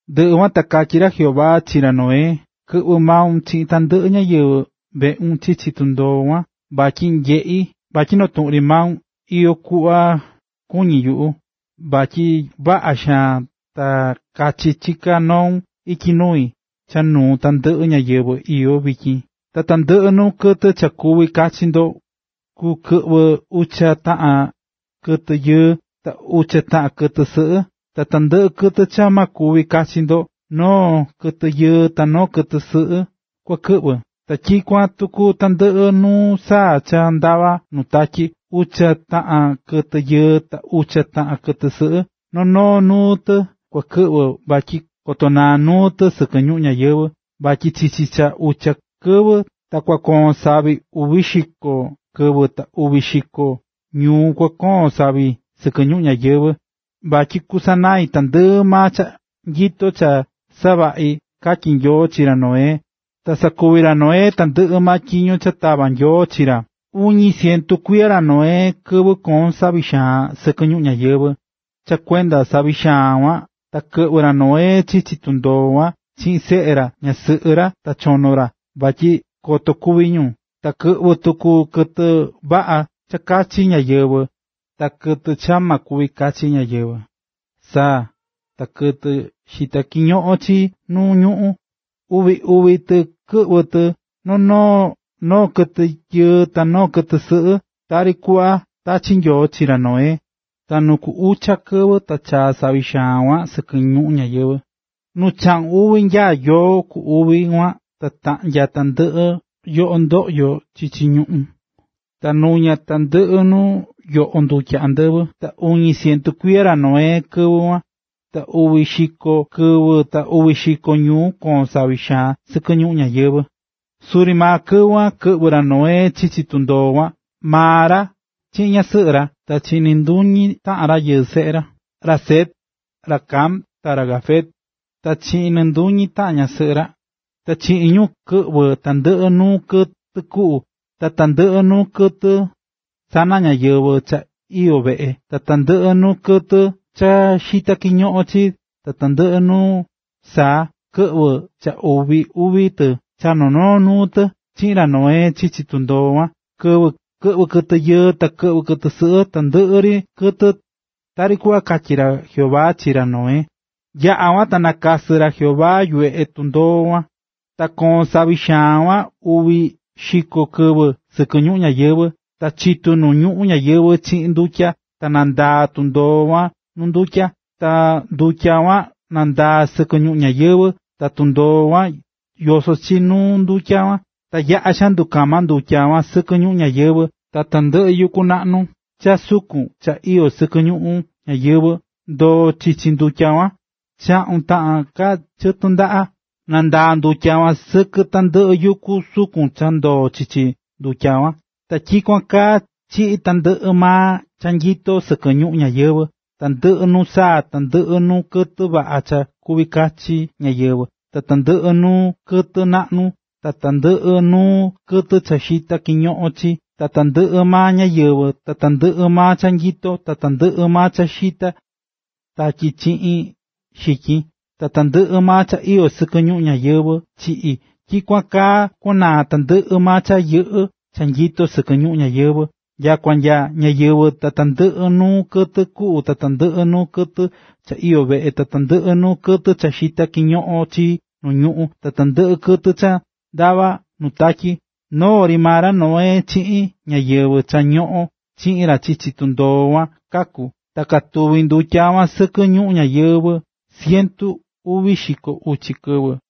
Ndɨꞌɨ kuan ta katyí ra Jehová chi ra Noé: “Kɨ̱ꞌvɨ maun chiꞌin tandɨꞌɨ ñáyɨvɨ veꞌun chichi tundoo kuan, vatyi nyeꞌí vatyi noo tuꞌun ri maun iyó kuꞌva kuñí yuꞌu, vatyi vaꞌa xaan ta kachi chiká noun ityi nui, cha nuu tandɨꞌɨ ñáyɨvɨ iyó vityin. Ta tandɨꞌɨ nuu kɨtɨ cha kuvi kachi ndo kukɨꞌvɨ ucha taꞌan kɨtɨ yɨɨ, ta ucha taꞌan kɨtɨ sɨꞌɨ. Ta tandɨꞌɨ kɨtɨ cha ma kuvi kachi ndo, noo kɨtɨ yɨɨ ta noo kɨtɨ sɨꞌɨ kua kɨꞌvɨ. Ta tyikuan tuku tandɨꞌɨ nuu saa cha ndavá nu tatyi, ucha taꞌan kɨtɨ yɨɨ, ta ucha taꞌan kɨtɨ sɨꞌɨ. Noo noo nuu tɨ kua kɨꞌvɨ, vatyi koto naa nuu tɨ sɨkɨ ñuꞌún ñayɨvɨ̱. Vatyi chichi cha ucha kɨvɨ, ta kusakoin savi uvi xiko kɨvɨ, ta uvi xiko ñuu kukoon savi sɨkɨ ñuꞌún ñayɨvɨ̱, vatyi kusanai tandɨꞌɨ maa cha nyito cha savaꞌi̱”, katyí Nyoo chi ra Noé. Ta sakuvi̱ ra Noé tandɨꞌɨ maa tyiño cha tava̱ Nyoo chi ra. Iñu cientu kuiya ra Noé kɨvɨ koo̱n savi xaan sɨkɨ ñuꞌún ñayɨvɨ̱. Cha kuenda savi xaan kuan, ta kɨꞌvɨ̱ ra Noé chichi tundoo kuan chiꞌin seꞌe ra, ñasɨꞌɨ ra ta chono ra, vatyi koto kúvi ñu. Ta kɨꞌvɨ̱ tuku kɨtɨ vaꞌa cha chachí ñáyɨvɨ, ta kɨtɨ cha ña chachí ñáyɨvɨ, saa ta kɨtɨ xitá kiñoꞌon chii nu ñuꞌún. Uvi uvi tɨ kakɨꞌvɨ tɨ, noo kɨtɨ yɨɨ ta noo kɨtɨ sɨꞌɨ, tari kuꞌva tachi̱ Nyoo tyiño chi ra Noé. Ta nu ku ucha kɨvɨ ta chaa̱ savi xaan kuan sɨkɨ ñuꞌún ñayɨvɨ̱. Nu chaꞌun uvi nyaá yoo ku uvi kuan ta taꞌnya̱ tandɨꞌɨ yoꞌo ndoꞌyo chichi ñuꞌún, ta nuña tandɨꞌɨ nu yoꞌo ndutya andɨvɨ. Ta iñu cientu kuiya ra Noé kɨvɨ kuan. Ta uvi xiko kɨvɨ ta uvi xiko ñuu koo̱n savi sɨkɨ ñuꞌún ñayɨvɨ̱. Suri maa kɨvɨ kuan kɨꞌvɨ̱ ra Noé chichi tundoo kuan, maa ra chiꞌin ñasɨꞌɨ ra, ta chiꞌin nɨɨ nduñi taꞌan rayɨɨ seꞌe ra, ra Sem, ra Cam ta ra Jafet ta chiꞌin nɨnduñi taꞌan ñasɨꞌɨ ra. Ta chiꞌin ñu kɨꞌvɨ̱ tandɨꞌɨ nuu kɨtɨ kuꞌu, ta tandɨꞌɨ nuu kɨtɨ sana ñáyɨvɨ cha iyó veꞌe, ta tandɨꞌɨ nuu kɨtɨ cha xitá kiñoꞌon chii, ta tandɨꞌɨ nuu saa. Kɨꞌvɨ̱ cha uvi uvi kɨtɨ, cha noo noo nuu tɨ, chiꞌin ra Noé chichi tundoo kuan. Kɨꞌvɨ̱ kɨtɨ yɨɨ, ta kɨtɨ sɨꞌɨ, tandɨꞌɨ ri nuu kɨtɨ, tari kuꞌva katyí maa ra Jehová chi ra Noé. Yaꞌa̱ kuan ta nakasɨ̱ ra Jehová yuveꞌe tundoo kuan. Ta koo̱n savi xaan kuan uvi xiko kɨvɨ sɨkɨ ñuꞌún ñayɨvɨ̱, ta chitu̱ nu ñuꞌún ñayɨvɨ̱ chiꞌin ndutya, ta nandaa̱ tundoo kuan nu ndutya. Ta ndutya kuan nandaa̱ sɨkɨ ñuꞌún ñayɨvɨ̱, ta tundoo kuan yosó chi nuu ndutya kuan. Ta yaꞌa̱ xaan ndukama ndutya kuan sɨkɨ ñuꞌún ñayɨvɨ̱, ta tandɨꞌɨ yuku naꞌnu cha sukun cha iyó sɨkɨ ñuꞌún ñayɨvɨ̱ ndoo̱ chichi ndutya kuan. Chaꞌun taꞌan ka chɨtɨ ndaꞌa, nandaa̱ ndutya kuan sɨkɨ tandɨꞌɨ yuku sukun cha ndoo̱ chichi ndutya kuan. Ta tyikuan kaa chiꞌi̱ tandɨꞌɨ maa cha nyito sɨkɨ ñuꞌún ñayɨvɨ̱, tandɨꞌɨ nuu saa, tandɨꞌɨ nuu kɨtɨ vaꞌa cha kuví kachi ñáyɨvɨ, ta tandɨꞌɨ nuu kɨtɨ naꞌnu, ta tandɨꞌɨ nuu kɨtɨ cha xitá kiñoꞌon chii, ta tandɨꞌɨ maa ñáyɨvɨ. Ta tandɨꞌɨ maa cha nyito, ta tandɨꞌɨ maa cha xitá tatyi chiꞌin xityin, ta tandɨꞌɨ maa cha iyó sɨkɨ ñuꞌún ñayɨvɨ̱ chiꞌi̱. Tyikuan kaa kuanaá tandɨꞌɨ maa cha yɨꞌɨ́ cha nyito sɨkɨ ñuꞌún ñayɨvɨ̱, nyakua nya ñáyɨvɨ ta tandɨꞌɨ nuu kɨtɨ kuꞌu, tandɨꞌɨ nuu kɨtɨ cha iyó veꞌe, tandɨꞌɨ nuu kɨtɨ cha xitá kiñoꞌon chii nu ñuꞌún, tandɨꞌɨ kɨtɨ cha ndavá nuu tatyi. Noo ri maa ra Noé chiꞌin ñáyɨvɨ cha ñoꞌón chiꞌin ra chichi tundoo kuan kaku̱. Ta katuvi̱ ndutya kuan sɨkɨ ñuꞌún ñayɨvɨ̱ cientu uvi xiko uchi kɨvɨ.